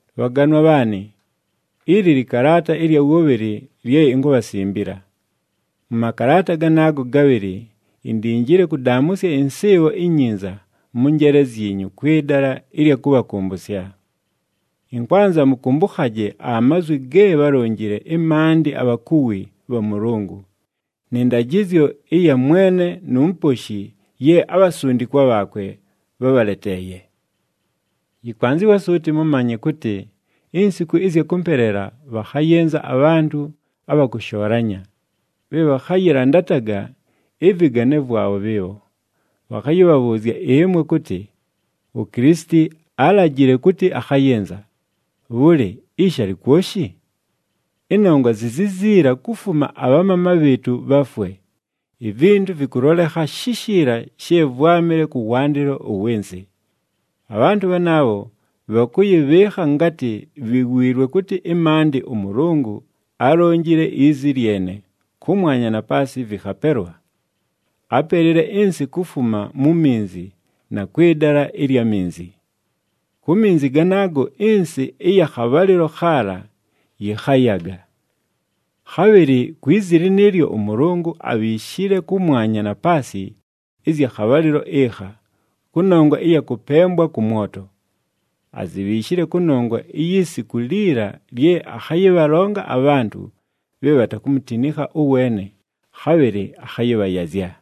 Bhaganwa bhaanɨ, ili lɨkalaata ɨlya wʉbhɨlɨ lye inkubhasimbila. Mʉ makalaata ganaago gabhɨlɨ indinjile kʉdaamʉsya ɨnsɨɨbho inyinza mʉ njeele zyinyu kwɨ dala ɨlya kʉbhakʉmbʉsya. Ɨnkwanza mʉkʉmbʉkhaje amazwi ge bhálonjile ɨmaandɨ abhakuwi bha Mʉlʉngʉ, nɨ ndajɨzyo ɨya Mwene nu Muposhi ye abhasundikwa bhaakwe bhábhaleteeye. Yɨkwanzɨwa suuti mʉmanye kʉtɨ insiku ɨzya kʉmpeleela bhakhayɨnza abhantʉ abha kʉshoolanya, bhe bhakhayɨlandataga ɨvɨgane vwabho bhɨɨbho. Bhakhayɨbhabhʉʉzya ɨmwe kʉtɨ, “UKilisiti álajile kʉtɨ akhayɨnza! Bhʉlɨ, ishi alɨ kwoshi? Ɨnongwa zi ziziila kufuma abhamaama bhɨɨtʉ bhafwe, ivintu vɨkʉlolekha shishiila she vwámɨle kʉwandɨlo ʉwɨ nsɨ!” Abhantʉ bhanaabho, bhakʉyɨbhɨɨkha ngatɨ bhiwiilwe kʉtɨ ɨmaandɨ ʉMʉlʉngʉ álonjile izi lyene, kʉmwanya na paasɨ vɨkhapelwa. Ápelile ɨnsɨ kufuma mu minzi na kwɨ dala ɨlya minzi. Ku minzi ganaago ɨnsɨ ɨya khabhalɨlo khaala yɨkhayaga. Khabhɨlɨ kwi zi lɨnɨɨlyo ʉMʉlʉngʉ abhiishile kʉmwanya na paasɨ ɨzya khabhalɨlo ɨkha, kʉnongwa ɨya kʉpembwa kʉ mwoto. Azibhiishile kʉnongwa iyi siku liila lye akhayɨbhalonga abhantʉ bhe bhatakumutinikha ʉweene, khabhɨlɨ akhayɨbhayazya.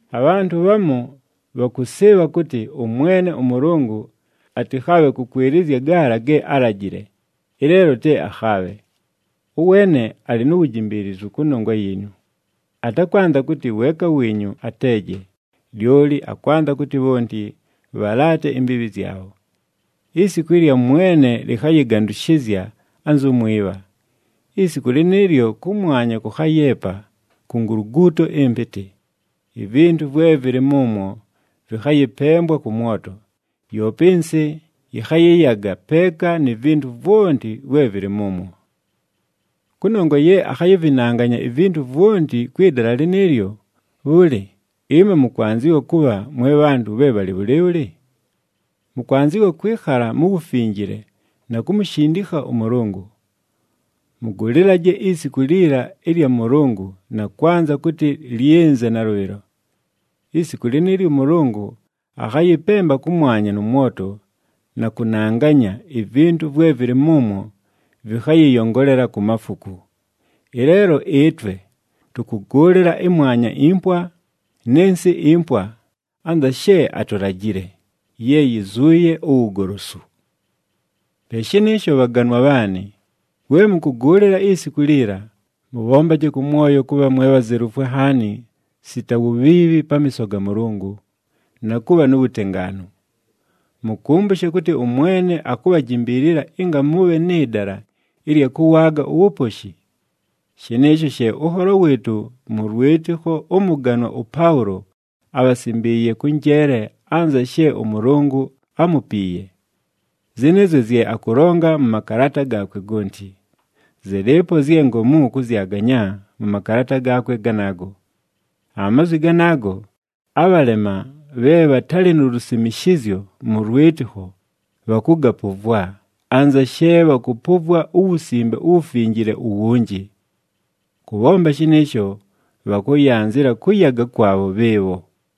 Abhantʉ bhamu bhakʉsɨɨbha kʉtɨ ʉMwene ʉMʉlʉngʉ atɨkhaabhe kʉkwɨlɨzya gaala ge álajile, ɨleelo te akhaabhe. Ʉweene alɨ nu wujimbiilizu kʉnongwa yiinyu, atakwanza kʉtɨ weeka wiinyu ateeje, lyoli akwanza kʉtɨ bhonti bhalaate imbiibhi zyabho. Isiku ɨlya Mwene lɨkhayɨgandʉshɨzya anzu mwibha. Isiku lɨnɨɨlyo, kʉmwanya kʉkhayeepa ku nguluguuto ɨmpɨtɨ, ivintu vwe vɨlɨ mʉmwo vɨkhayɨpembwa kʉ mwoto, yoope ɨnsɨ yɨkhayɨyaga peeka ni vintu vwonti vwe vɨlɨ mʉmwo. Kʉnongwa ye akhayɨvɨnanganya ivintu vwonti kwɨ dala lɨnɨɨlyo, bhʉlɨ, ɨmwe mʉkwanzɨwa kʉbha mwe bhantʉ bhe bhalɨ bhʉlɨɨbhʉlɨ? Mʉkwanzɨwa kwɨkhala mu wufinjile na kumushindikha ʉMʉlʉngʉ. Mʉgʉlɨlaje isiku liila ɨlya Mʉlʉngʉ na kwanza kʉtɨ lyɨnze nalʉbhɨlo. Isiku lɨnɨɨlyo ʉMʉlʉngʉ akhayɨpemba kʉmwanya nʉ mwoto na kʉnanganya, ivintu vwe vɨlɨ mʉmwo vɨkhayɨyongolela ku mafuku. Ɨleelo ɨtwe tʉkʉgʉʉlɨla ɨmwanya impwa nɨ nsɨ impwa anza she atulajile, ye yizuuye uwugolosu. Pe shɨnɨɨsho bhaganwa bhaanɨ, we mʉkʉgʉʉlɨla isiku liila, mʉbhombaje kʉ mwoyo kʉbha mwe bhazelufwe nhaani sita wubhiibhi pamiiso ga Mʉlʉngʉ, na kʉbha nu wutengaanu. Mʉkʉmbʉshe kʉtɨ ʉMwene akubhajimbiilila ɨnga mʉbhe nɨ dala ɨlya kʉwaaga uwuposhi. Shɨnɨɨsho she ʉnholo wɨɨtʉ mʉ lwɨtɨkho ʉmʉganwa ʉPaʉlo ábhasimbiiye kʉ njeele anza she ʉMʉlʉngʉ ámupiiye. Zɨnɨɨzyo zye akʉlonga mʉ makalaata gaakwe gonti. Zɨlɨɨpo zye ngomu kʉzyaganya mʉ makalaata gaakwe ganaago. Amazwi ganaago, abhalema bhe bhatalɨ nu lusimishizyo mʉ lwɨtɨkho bhakʉgapʉvwa, anza she bhakʉpʉvwa uWusimbe uWufinjile uwunji. Kʉbhomba shɨnɨɨsho, bhakʉyanzɨla kʉyaga kwabho bhɨɨbho.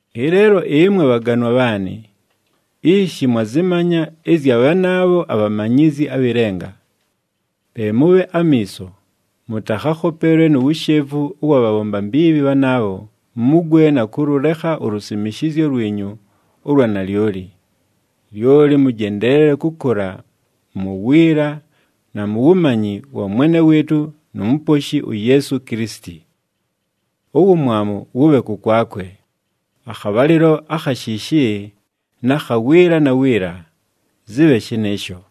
Ɨleelo ɨmwe bhaganwa bhaanɨ, ishi mwazɨmanya ɨzya bhanaabho abhamanyizyi abhɨ lenga. Pe mʉbhe amiiso, mʉtakhakhopelwe nu wushevu ʉwa bhabhomba mbiibhi bhanaabho mugwe na kʉlʉlekha ulusimishizyo lwinyu ʉlwa nalyoli. Lyoli mʉjendeelele kʉkʉla mu wiila na mu wumanyi wa Mwene wɨɨtʉ nu Muposhi uYeesu Kilisiti. Uwumwamu wʉbhe kʉkwakwe, akhabhalɨlo akha shiishi na kha wiila na wiila! Zɨbhe shɨnɨɨsho.